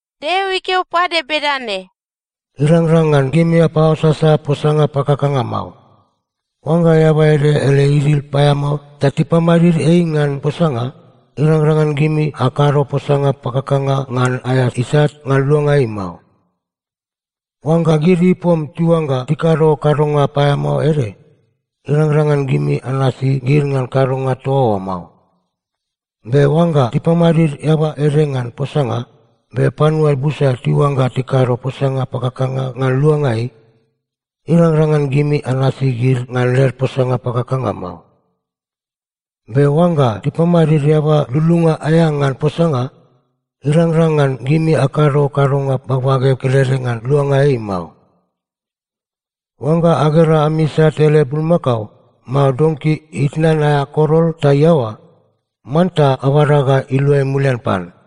Deo ikeo pade bedane, “Irangrang ngan gimi apaoasasa posanga pakakanga mao. Oangga eaba ede ele idil paeamao ta tipamadid ei ngan posanga, irangrang ngan gimi akado posanga pakakanga ngan aea isat ngan luanga ei mao. “Oangga gid ipom tiuangga tikado kadonga paeamao ede, irangrang ngan gimi anasi gid ngan kadonga toa oa mao. Be oangga tipamadid eaba ede ngan posanga, be panua busa tiuangga tikado posanga pakakanga ngan luanga ei, irangrang ngan gimi anasi gid ngan led posanga pakakanga mao. Be oangga tipamadid eaba lululunga aea ngan posanga, irangrang ngan gimi akado kadonga bagbage kelede ngan luanga ei mao. “Oangga agera ami isat ele bulmakao, mao donki itnan aea korol ta iaoa, manta abada ga iluai mulian pan.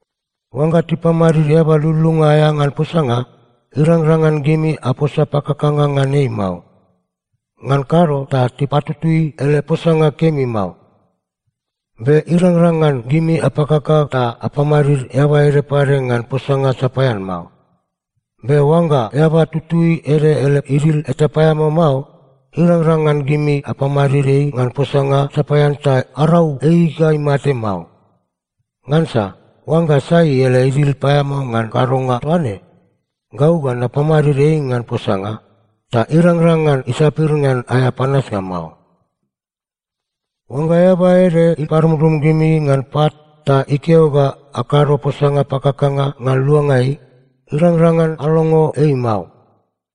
“Oangga tipamadid eaba lululunga aea ngan posanga, irangrang ngan gimi aposa pakakanga ngan ei mao. Ngan kado ta tipatutui ele posanga kemi mao. Be irangrang ngan gimi apakaka ta apamadid eaba ede pade ngan posanga sapaean mao. Be oangga eaba tutui ede ele idil eta paeamao mao, irangrang ngan gimi apamadid ei ngan posanga sapaean ta arau ei ga imate mao. Ngansa oangga sai ele idil paeamao ngan kadonga toaine, gau ga napamadid ei ngan posanga, ta irangrang ngan isapir ngan aea panasnga mao. “Oangga eaba ede iparumrum gimi ngan pat ta ikeo ga akado posanga pakakanga ngan luanga ei, irangrang ngan alongo ei mao.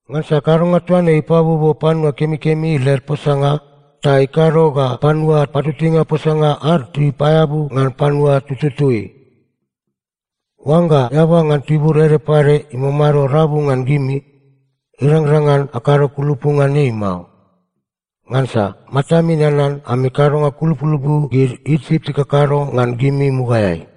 Ngansa kadonga toaine ipabuobuo panua kemikemi led posanga ta ikado ga panua patutuinga posanga ad tipaeabu ngan panua tututui. “Oangga eaba ngan tibur ede pade imamado rabu ngan gimi, irangrang ngan akado kulupu ngan ei mao. Ngansa matami nanan ami kadonga kulupulupu gid Isip tikakado ngan gimi mugaeai.”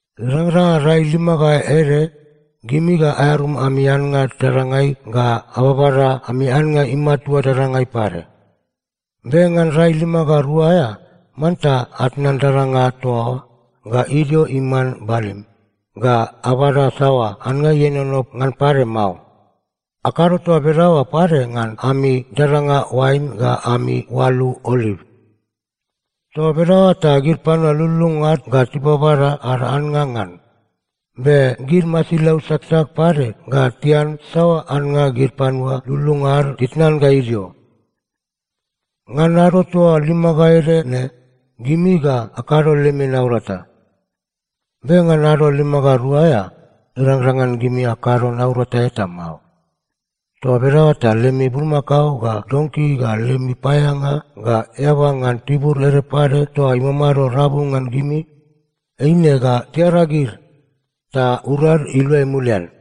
“Irangrang ngan rai lima ga ede, gimi ga aearum ami annga dadangai ga ababada ami annga imatua dadangai pade. Be ngan rai lima ga rua aea, manta atnan dadanga toa oa ga idio iman balim, ga abada saoa annga ienono ngan pade mao. Akado toa bedaoa pade ngan ami dadanga oain ga ami oalu oliv. Toa bedaoa ta gid panua lululunga ad ga tibabada ad annga ngan, be gid masilau saksak pade ga tian saoa annga gid panua lululunga ad titnan ga idio. “Ngan ado toa lima ga ede ne, gimi ga akado lemi naurata. Be ngan ado lima ga rua aea, irangrang ngan gimi akado naurata eta mao. Toa bedaoa ta lemi bulmakao ga donki ga lemi paeaeanga ga eaba ngan tibur ede pade toa imamado rabu ngan gimi, eine ga tiaragid, ta urad iluai mulian.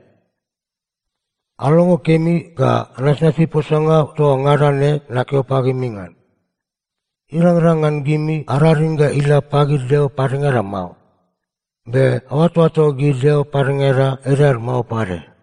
“Alongo kemi ga anasnasi posanga toa ngada ne nakeo pagimi ngan. Irangrang ngan gimi araring ga ila pagid deo padengada mao. Be aoatoato gid deo padengada edad mao pade.”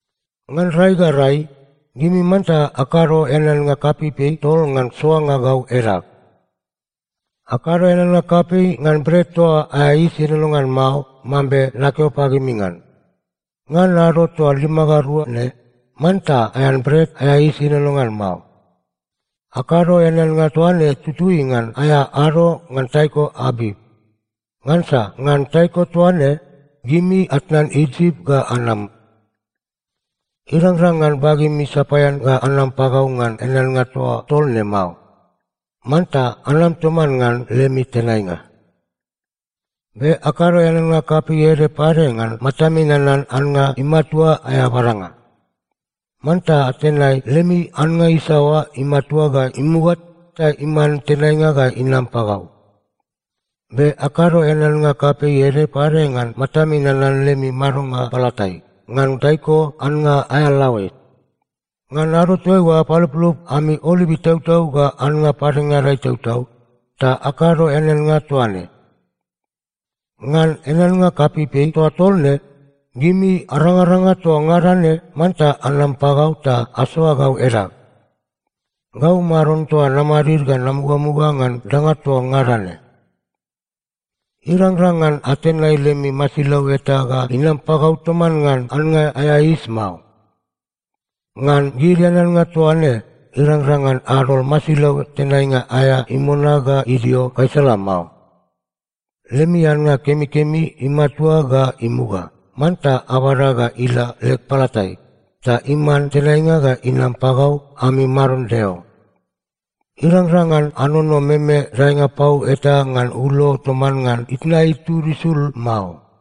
“Ngan rai ga rai, gimi manta akado eaneannga kapeipei tol ngan soanga gau edag. “Akado eaneannga kapei ngan Bret toa aea Yis Ienono ngan Mao mambe nakeo pagimi ngan. Ngan ado toa lima ga rua ne, manta aean bret aea yis ienono ngan mao. Akado eaneannga toa ne tutui ngan aea ado ngan taiko Abip. Ngansa ngan taiko toa ne, gimi atnan Isip ga anam. “Irangrang ngan bagemi sapaean ga anama pagau ngan eaneannga toa tol ne mao. Manta anam toman ngan lemi tenainga. “Be akado eaneannga kapei ede pade ngan Matami Nanan Annga Imatua aea Badanga. Manta atenai lemi annga isaoa imatua ga imuga ta iman tenainga ga inam pagau. “Be akado eaneannga kapei ede pade ngan Matami Nanan lemi Madonga Palatai, ngan taiko annga aea laoe. Ngan ado toaiua apaluplup ami oliv itautau ga annga padengada itautau, ta akado eaneannga toa ne. “Ngan eaneannga kapeipei toa tol ne, gimi arangaranga toa ngada ne manta anam pagau ta asoa gau edag. Gau Maron toa namadid ga namugamuga ngan danga toa ngada ne. “Irangrang ngan atenai lemi masilau eta ga inam pagau toman ngan annga aea yis mao. “Ngan gid eaneannga toa ne irangrang ngan adol masilau tenainga aea imona ga idio gaisala mao. “Lemi annga kemikemi imatua ga imuga, manta abada ga ila leg palatai, ta iman tenainga ga inam pagau ami Maron Deo. “Irangrang ngan anono meme daenga pau eta ngan ulo toman ngan itna itud isul mao.”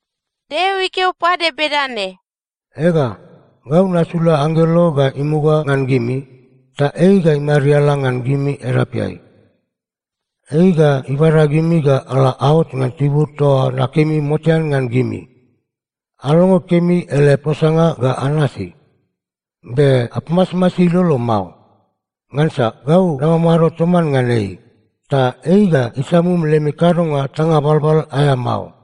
Deo ikeo pade bedane, “Ega, gau nasula anggelo ga imuga ngan gimi, ta ei ga imariala ngan gimi edapeai. Ei ga ibada gimi ga ala aot ngan tibur toa nakemi motean ngan gimi. Alongo kemi ele posanga ga anasi. Be apamasmasi ilolo mao. Ngansa gau namamado toman ngan ei, ta ei ga isamum lemi kadonga tanga balbal aea mao.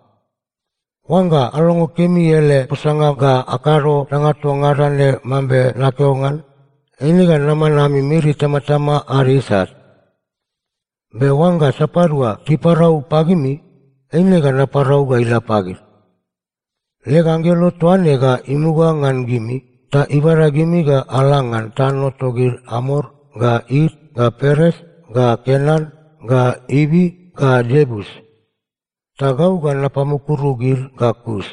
Oangga alongo kemi ele posanga ga akado danga toa ngada ne mambe nakeo ngan, eine ga naman ami miri itamatama ad isat. Be oangga sapadua tiparau pagimi, eine ga naparau ga ila pagid. Leg anggelo toa ne ga imuga ngan gimi ta ibada gimi ga ala ngan tano togid Amor ga It ga Peres ga Kenan ga Ivi ga Iebus. Ta gau ga napamukuru gid ga kus.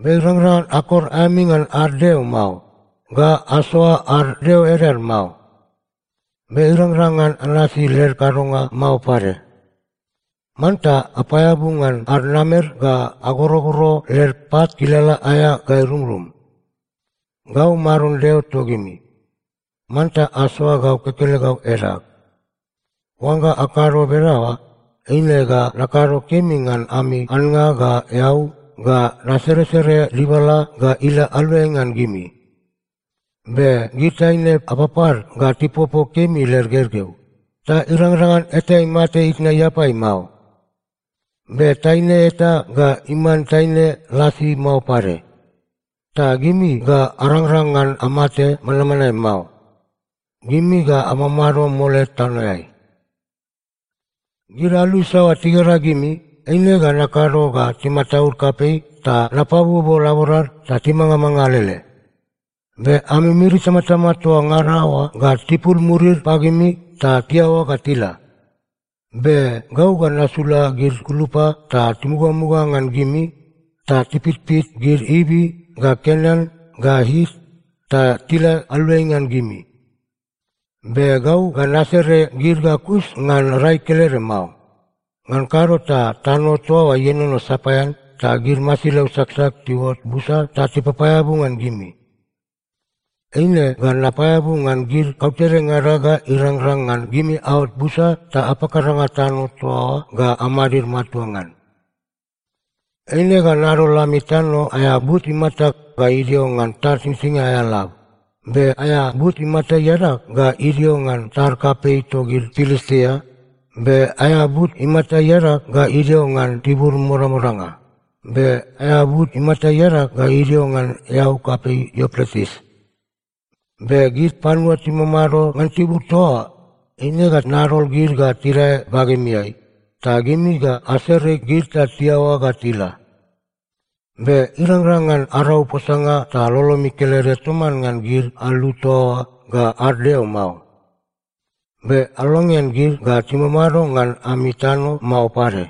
Be irangrang ngan akor aemi ngan ad deo mao, ga asoa ad deo edad mao. Be irangrang ngan anasi led kadonga mao pade. Manta apaeabu ngan ad namer ga agorogoro led pat kilala aea ga irumrum. Gau Maron Deo togimi. Manta asoa gau kekelegau edag. Oangga akado bedaoa, eine ga nakado kemi ngan ami annga ga eau, ga naseresere dibala ga ila aluai ngan gimi. Be gid taine apapad ga tipopo kemi led gergeu, ta irangrang ngan eta imate itna iapai mao. Be taine eta ga iman taine lasi mao pade. Ta gimi ga arangrang ngan amate manmanae mao. Gimi ga amamado mole tanoeai. “Gid alu isaoa tigera gimi, eine ga nakado ga timataud kapei ta napabuobuo laborad ta timangamanga alele. Be ami miri itamatama toa ngada oa ga tipul murid pagimi ta tiaoa ga tila. Be gau ga nasula gid gulupa ta timugamuga ngan gimi, ta tipitpit gid Ivi ga Kenan ga It, ta tila aluai ngan gimi. Be gau ga nasere gid ga kus ngan rai kelede mao. Ngan kado ta tano toa oa ienono sapaean ta gid masilau saksak tiuot busa ta tipapaeabu ngan gimi. Eine ga napaeabu ngan gid kautedengada ga irangrang ngan gimi aot busa ta apakaranga tano toa oa ga amadid matua ngan. “Eine ga nadol ami tano aea but imata ga idio ngan tad Singsingia aea lab, be aea but imata iadag ga idio ngan tad kapei togid Pilistia, be aea but imata iadag ga idio ngan tibur modamodanga, be aea but imata iadag ga idio ngan eau kapei Iupretis. Be gid panua timamado ngan tibur toa oa, eine ga nadol gid ga tidae bagemiai, ta gimi ga asere gid ta tiaoa ga tila. Be irangrang ngan arau posanga ta lolomi kelede toman ngan gid alu toa oa ga ad deo mao. Be alongean gid ga timamado ngan ami tano mao pade.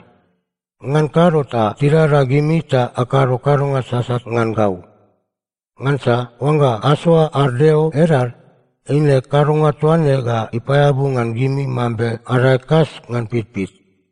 Ngan kado ta tidada gimi ta akado kadonga sasat ngan gau. Ngansa oangga asoa ad deo edad, eine kadonga toa ne ga ipaeabu ngan gimi mambe adae kas ngan pitpit.”